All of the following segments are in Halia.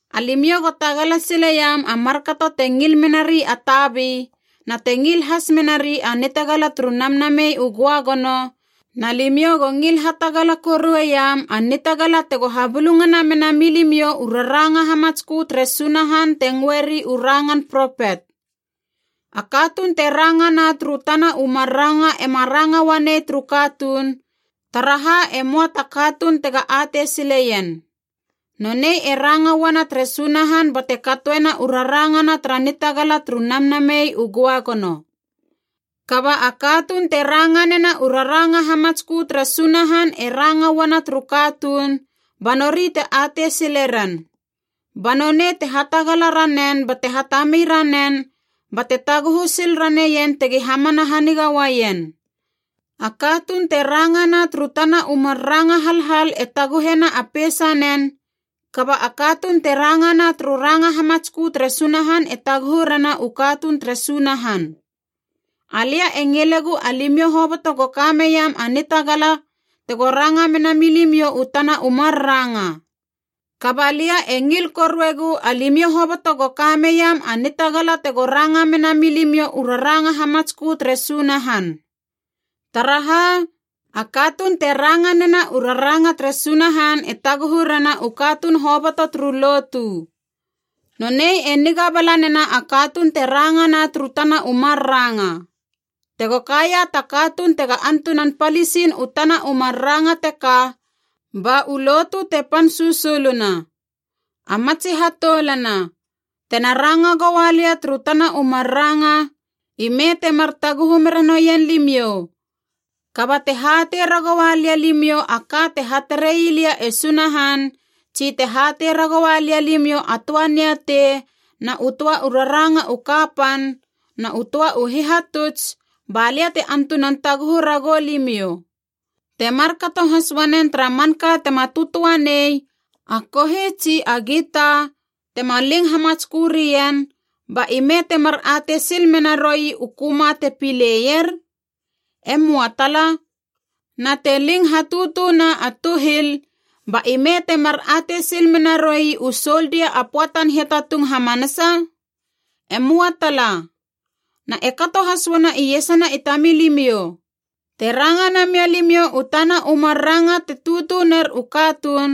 Alimiou go tagala sileiam a markato te ngil menari a tabi, na te ngil has menari a nitagala turu Namnamei u Göagono, na limiou go ngil hatagala korueiam a nitagala tego habulungana mena milimiou u raranga hamatskö tere Sunahan te ngöeri u rangan propet. A katuun te ranga na turu tana u mar ranga ema ranga uanei turu katuun, taraha e möa ta katuun tega atei sileien. Nonei e ranga uana tere Sunahan bate katoena u rarangana tara nitagala turu Namnamei u Göagono. Kaba a katuun te ranga nena u raranga u hamatskö tere Sunahan e ranga uana turu katuun, ba nori te atei sile ren. Ba nonei te hatagala ranen bate hatami ranen ba te taguhu sil raneien tegi hamana haniga uaien. A katuun te rangana turu tana u mar ranga halhal e taguhena a peisanen, kaba a katuun te rangana turu ranga hamatskö tere Sunahan e taguhu rena u katuun tere Sunahan. Alia e ngilegu alimiou hoboto go ka meiam a nitagala tego ranga mena milimiou u tana u mar ranga. Kaba lia e ngil koruegu alimiou hoboto go ka meiam a nitagala tego ranga mena milimiou u raranga hamatskö tere Sunahan. Taraha, a katuun te ranga nena u raranga tere Sunahan e taguhu rena u katuun hoboto turu lotu. Nonei e niga bala nena a katuun te ranga na turu tana u mar ranga. Tego kaia ta katuun tega antunan palisin u tana u mar ranga teka ba u lotu te pan susuluna. A matsi hatoulana, tena ranga goua lia turu tana u mar ranga, ime temar taguhu mera noien limiou. Kaba te hatei ragoua lia limiou a ka te hatarei lia e Sunahan, tsi te hatei ragoua lia limiou a töa niatei na u töa u raranga u kapan na u töa u hihatuts, ba lia te antunan taguhu ragou limiou. Te markato has uanen tara manka tema tötöa nei, a kohi tsi a gita, tema ling hamatskö rien, ba ime temar atei sil mena roi u köma te pileier? E möa tala. Na te ling hatutuna a tuhil, ba ime temar atei sil mena roi u soldia a pöatan hiatatung hamanasa? E möa tala. Na e kato has uana iesana i tamilimiou. Te ranga namia limiou u tana u mar ranga te tutu ner u katuun,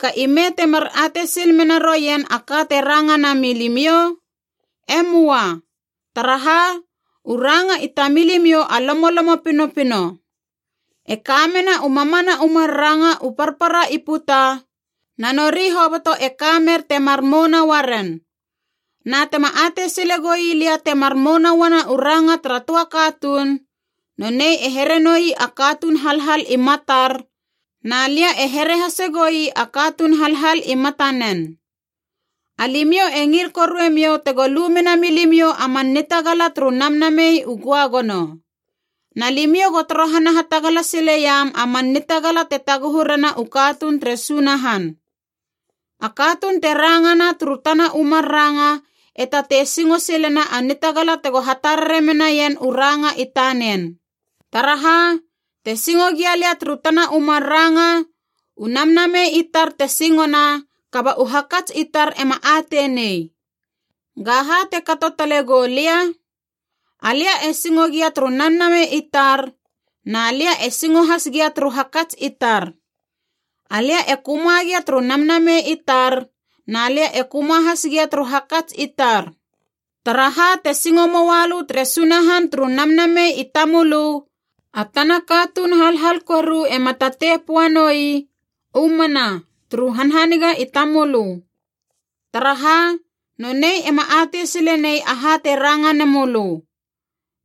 ga ime temar atei sil mena roien a ka te ranga nami limiou? E möa. Taraha, u ranga i tamilimiou a lomolomo pinopino. E kamena u mamana u mar ranga u parpara i puta, na nori hoboto e ka mer te mar mouna uaren. Na tema atei sile goi lia temar mouna uana u ranga tara töa katuun, nonei e here noi a katuun halhal i matar, na lia e here hasegoi a katuun halhal i matanen. Alimiou e ngil koruemiou tego lu mena milimiou a man nitagala turu Namnamei u Göagono. Na limiou go torohana hatagala sileiam a man nitagala te taguhu rena u katuun tere Sunahan. A katuun te rangana turu tana u mar ranga e tatei singo silena a nitagala tego hatarare menaien u ranga i tanen. Taraha, te singo gia lia turu tana u mar ranga, u namnamei i tar te singona, kaba u hakats i tar ema atei nei. Gaha te kato tale gou lia? Alia e singo gia turu namnamei i tar, na lia e singo has gia turu hakats i tar. Alia e köma gia turu namnamei i tar, na lia e köma has gia turu hakats i tar. Taraha te singo moalö tere Sunahan turu namnamei i tamölö, a tana katuun halhal koru ema tatei poa noi “U mana” turu hanhaniga i tamölö. Taraha, nonei ema atei sile nei aha te ranga nemölö.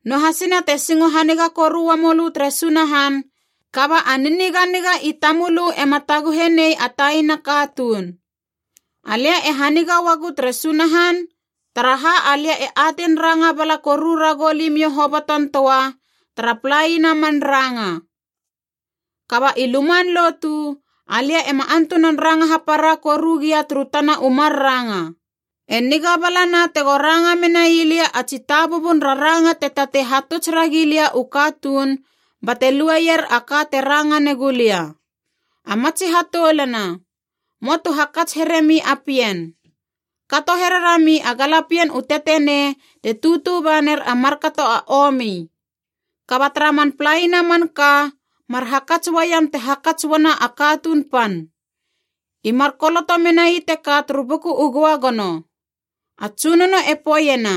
Noahasina te singo haniga koru uamölö tere Sunahan kaba a niniganiga i tamölö ema taguhe nei a taina katuun. Alia e haniga uagu tere Sunahan taraha, alia e atein ranga bala koru ragou limiou hoboton töa tara palaina man ranga. Kaba i luman lotu, alia ema antunan ranga hapara koru gia turu tana u mar ranga, e niga balana tego ranga menai lia a tsi tabubun raranga te tatei hatuts ragi lia u katuun bate lueier a ka te ranga negulia. A matsi hatoulana, möa tu hakats here mi a pien. Kato here rami a galapien u tetenei te tutu ba ner a markato a omi. Kaba tara man palaina manka, mar hakats uaiam te hakats uana a katuun pan. I mar koloto menai teka turu Buku u Göagono: “A Tsunono e poeiena,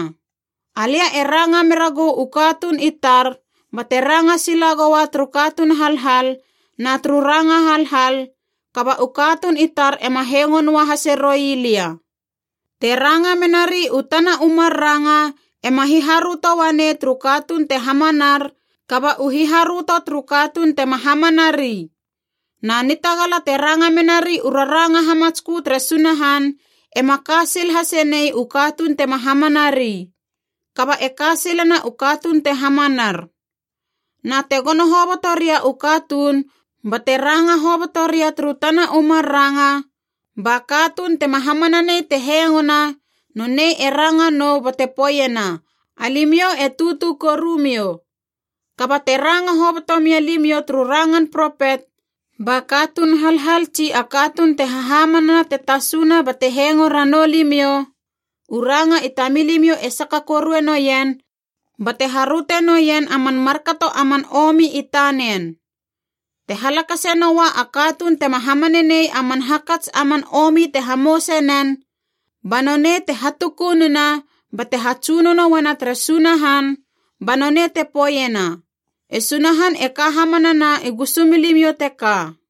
‘Alia e ranga mera gou u katuun i tar bate ranga sila goua turu katuun halhal na turu ranga halhal, kaba u katuun i tar ema hengo noa hase roi lia.’” Te ranga menari u tana u mar ranga ema hiharöto uanei turu katuun te hamanar kaba u hiharöto turu katuun tema hamana ri. Na nitagala te ranga menari u raranga hamatskö tere Sunahan ema ka sil hase nei u katuun tema hamanari. Kaba e ka silena u katuun te hamanar. Na te gono hoboto ria u katuun bate ranga hoboto ria turu tana u mar ranga, ba katuun tema hamananei te hengona, nonei e ranga nou bate poeiena alimiou e tutu korumiou. Kaba te ranga hoboto mia limiou turu rangan propet, ba katuun halhal tsi a katuun te hahamanana te tasuna bate hengo ranou limiou, u ranga i tamilimiou e saka korue noien bate haröte noien a man markato a man omi i tanen. Te halakase noa a katuun tema hamananei a man hakats a man omi te hamouse nen, ba nonei te hatukununa bate hatsunono uana tere Sunahan ba nonei te poeiena, “E Sunahan e ka hamanana i gusumilimiou teka!”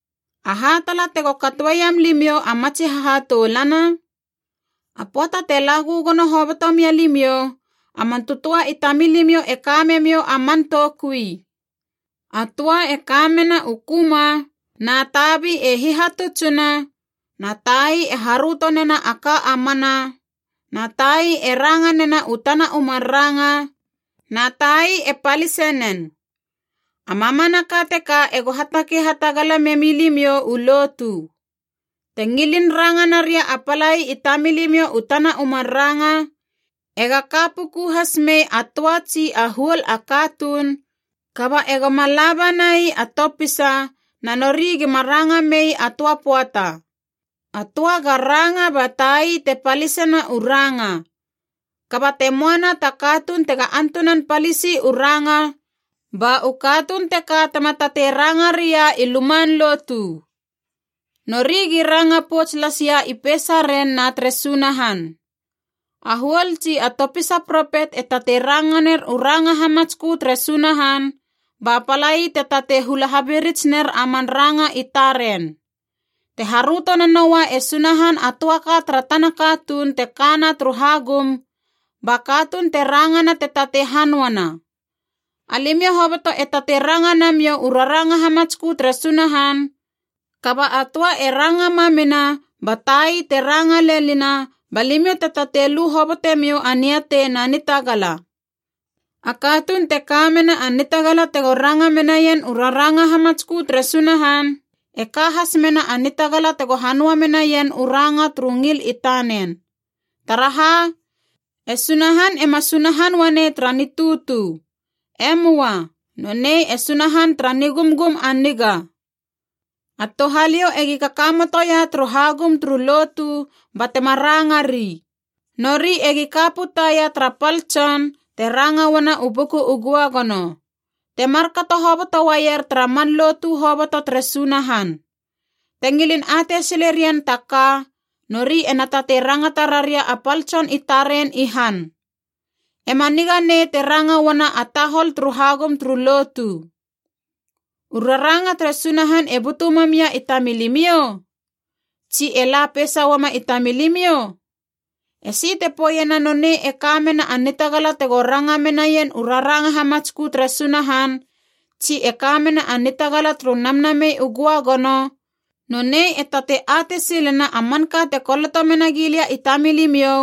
Aha tala tego katoeiam limiou a matsi hahatoulana? A pöata te la gögono hoboto mia limiou, a man tötöa i tamilimiou e ka memiou a man toukui. A töa e kamena u köma, na tabi e hihatutsuna, na tai e haröto nena a ka a mana, na tai e ranga nena u tana u mar ranga, na tai e palise nen. A mamanaka teka ego hatakei hatagala memilimiou u lotu. Te ngilin ranga naria a palai i tamilimiou u tana u mar ranga, ega ka puku has mei a töa tsi a huol a katuun, kaba ega ma la banai a topisa na nori gima ranga mei a töa pöata. A töa ga ranga ba tai te palisena u ranga. Kaba te moana ta katuun tega antunan palisi u ranga, ba u katuun teka tema tatei ranga ria i luman lotu. Nori gi ranga pouts las ia i peisaren na tere Sunahan. A huol tsi a topisa propet e tatei ranga ner u ranga hamatskö tere Sunahan, ba palai te tatei hula habirits ner a man ranga i taren. Te haröto nanoua e Sunahan a töa ka tara tana katuun te kana turu hagum, ba katuun te rangana te tatei hanöana. Alimiou hoboto e tatei ranga namiou u raranga hamatskö tere Sunahan, kaba a töa e ranga mamina ba tai te ranga lenina ba limiou te tatei lu hobotemiou a niatei na nitagala. A katuun te ka mena a nitagala tego ranga menaien u raranga hamatskö tere Sunahan e ka has mena a nitagala tego hanöa menaien u ranga turu ngil i tanen. Taraha, e Sunahan ema Sunahan uanei tara nitutu. E möa, nonei e Sunahan tara nigumgum a niga. A touhaliou egi kakamotoia turu hagum turu lotu batema ranga ri. Nori egi ka putaia tara pal tson, te ranga uana u Buku u Göagono. Te markato hoboto uaier tara man lotu hoboto tere Sunahan. Te ngilin atei sile rien ta ka, nori ena tatei rangata raria a pal tson i taren i han. E ma niga nei te ranga uana a tahol turu hagum turu lotu. U raranga tere Sunahan e butu mam ia i tamilimiou? Tsi e la peisa uama i tamilimiou? Esi te poeiena nonei e ka mena a nitagala tego ranga menaien u raranga hamatskö tere Sunahan tsi e ka mena a nitagala turu Namnamei u Göagono, nonei e tatei atei silena a manka te koloto mena gilia i tamilimiou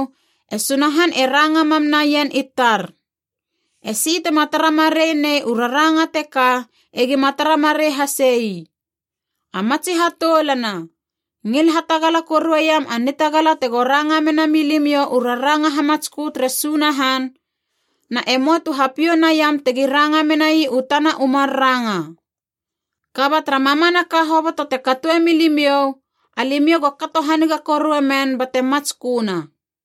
e Sunahan e ranga mam naien i tar. Esi tema tara marei nei u raranga teka egima tara marei hase ii. A matsi hatoulana, ngil hatagala korueiam a nitagala tego ranga mena milimiou u raranga hamatskö tere Sunahan, na e möa tu hapiou naim tegi ranga menai u tana u mar ranga. Kaba tara mamanaka hoboto te katoe milimiou, alimiou go kato haniga korue men bate matsköna.